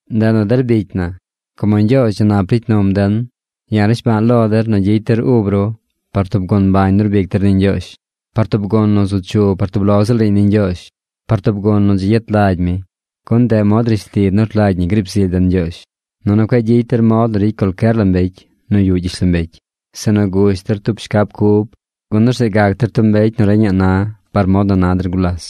Ndeꞌ nu der bicy na, como Ñgyoozh dzi nap ricy num den, ya̱ rnishba̱a̱ lo der nu gyicy der ub ru par tub gun mbañ nu rbic der ni Ñgyoozh, par tub gun nu zu chu par tub lo ziꞌl riiñ ni Ñgyoozh, par tub gun nu dzi gyet lagy mi, gun ndeꞌ mod rishli nu rlagy ñi griib zily den Ñgyoozh. Nunu cueꞌ gyicy der mod nu ricy cualcyer la mbecy nu yuꞌ gyishlombecy, sinu gush der tub shcab cub, gun orzeꞌ gac der tub mbecy nu reñaꞌ na par mod nu na der gulas.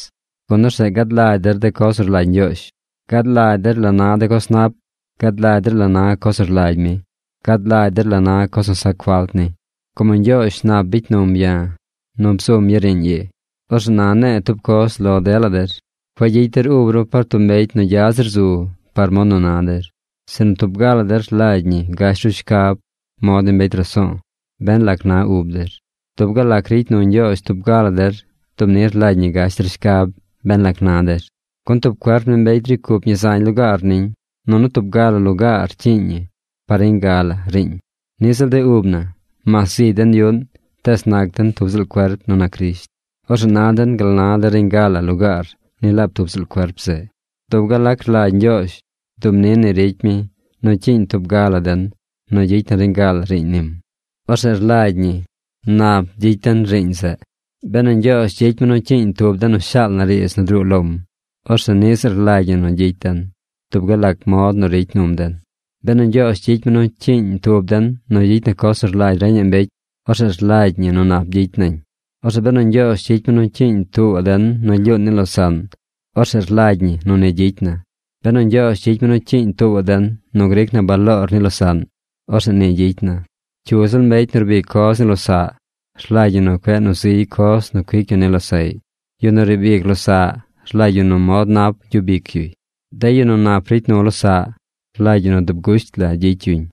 Gun orzeꞌ gad lagy der de coz nu rlagy Ñgyoozh. Gad lagy der la na de coz nap. Gad lagy der la na coz nu rlagy mi. Gad lagy der la na coz nu sac falt ni. Como Ñgyoozh nap bicy num ya̱ nu bzum ya̱ riiñ ii, orzeꞌ na ne̱e̱ tub coz lo dela der. Cueꞌ gyicy der ub ru par tub mbecy nu gya zir zu par mod nu na der, sinu tub ga la der rlagy ñi gash ru schab mod ni mbecy raso̱o̱ ben lac na ub der. Dub gal lac ricy nu Ñgyoozh tub ga la der dub ni rlagy ñi gash der shcab ben lac na der. Gun tub cuerp ni mbecy ricy cup ñi zañ lugaar niñ, nunu tub ga la lugaar rcyiiñ ñi par reñ ga la riiñ. Niꞌ ziꞌl de ub na. Mas zigy den yuꞌn, tees nac den tub ziꞌl cuerp nu nac Crisht. Orzeꞌ na den gal nu na de reñ ga la lugaar ni laab tub ziꞌl cuerp zeꞌ. Dub gal lac rlagy Ñgyoozh, dub ni ricy mi nu cyiiñ tub ga la den nu gyicy na reñ ga la riiñ nim. Orzeꞌ rlagy ñi nap gyicy den riiñ zeꞌ. Benu Ñgyoozh gyicy mi nu cyiiñ tub den nu shaal na riidz nu druu lom, orzeꞌ niꞌ ziꞌl rlagy ñi nu gyicy den, dub gal lac mod nu ricy num den. Benu Ñgyoozh gyicy mi nu cyiiñ tub den nu gyicy na coz nu rlagy reñaꞌ mbecy, orzeꞌ rlagy ñi nu nap gyicy nañ. Orzeꞌ benu Ñgyoozh gyicy mi nu cyiiñ tuubaꞌ den nu lyuun ni losaꞌn, orzeꞌ rlagy ñi nu ni gyicy na. Benu Ñgyoozh gyicy mi nu cyiiñ tuubaꞌ den nu gric na baloor ni losaꞌn, orzeꞌ ni gyicy na. Cyu ziꞌl mbecy nu rbic coz ni losaꞌ, rlagy ñi nu cueꞌ nu ziy coz nu cuic yu ni losaꞌy. Yu nu riib ic losaꞌ rlagy ñi nu mod nap gyub ic yuy. De yu nu nap ricy nu losaꞌ, rlagy ñi nu dub gusht la gyicy yuñ.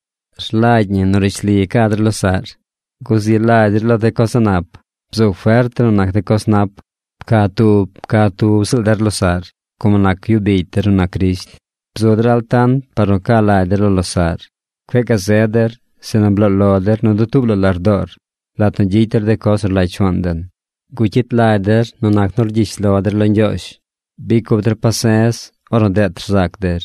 Rlagy ñi nu rishli ca der losaꞌr. Guzi lagy der lo de coz a̱ꞌ nap. Bzu fert der nu nac de coz nap. Pca tub pca tub ziꞌl der losaꞌr como nac yu bicy der nu nac Crisht. Bzu der altant par nu ca lagy der lo losaꞌr. Cueꞌ gazed der, sinu bloo lo der nu dutuub la lardoor lat nu gyicy der de coz nu rlagy Shuaan den. Gucyit lagy der nu nac nu rgyish lo der lo Ñgyoozh. Bicy cup der pase̱z ornu deet rzac der.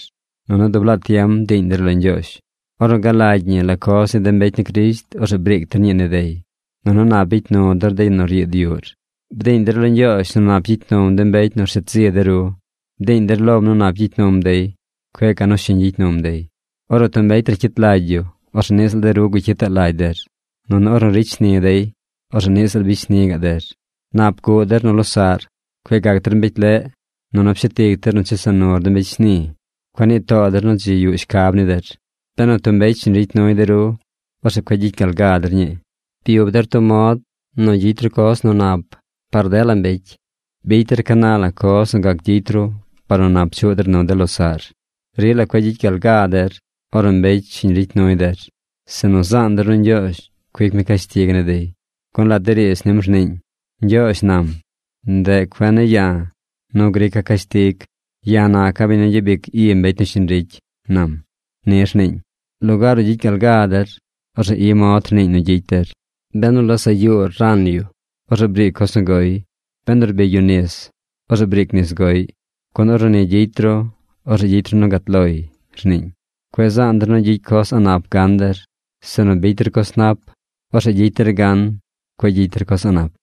Nunu dub laa tiem bdiiñ der lo Ñgyoozh. Ornu galagy ñi la coz ni de mbecy ni Crisht, orzeꞌ briic der ñii ni dey, nunu nap bicy nu der de yu nu ryiid yuꞌr. Bdiiñ der lo Ñgyoozh nu nap gyicy num de mbecy nu rshet zi de ru. Bdiiñ der lom nu nap gyicy num dey. Cueꞌ ca nu shiñ gyicy num dey. Ornu tub mbecy racyit lagy yu, orzeꞌ niꞌ ziꞌl de ru gucyitaꞌ lagy der. Nunu ornu ricy shni dey, orzeꞌ niꞌ ziꞌl bicy shni gaꞌ der. Nap guꞌ der nu losaꞌr. Cueꞌ gac der mbecy leꞌ. Nunu pshet ic der nu chesa nur de mbecy shni. Cueꞌ nii too der nu dzi yuꞌ shcab ni der. Benu tub mbecy shiñ ricy nuy de ru, orzeꞌ cueꞌ gyicy gal ga der ñii. Byub der tub mod nu gyicy ru coz nu nap par dela mbecy. Bicy der ca na la coz nu gac gyicy ru par nu nap chuꞌ der nu de losaꞌr. Rila cueꞌ gyicy gal ga der ornu mbecy shiñ ricy nuy der, sinu zaan der nu Ñgyoozh cuic mi cashtig ni dey. Gun lat de riidz nim rniiñ: “Ñgyoozh nam: ndeꞌ cuen ne̱ ya̱ nu grica̱ cashtig. Ya̱ naca̱ biñ nu gyabic i mbecy nu shiñ ricy, nam.” Ni rniiñ. Lugaar nu gyicy gal gaa der, orzeꞌ i mod rniiñ nu gyicy der: “Benu losaꞌ yuur ran yu, orzeꞌ briic coz nu goy. Benu rbigy yu nis, orzeꞌ briic nis goꞌy, gun ornu ni gyicy ru, orzeꞌ gyicy ru nu gat loy”, rniiñ. Cueꞌ zaan der nu gyicy coz a̱ꞌ nap gan der, sinu bicy der coz nap. Orzeꞌ gyicy der gan, cueꞌ gyicy der coz a̱ꞌ nap.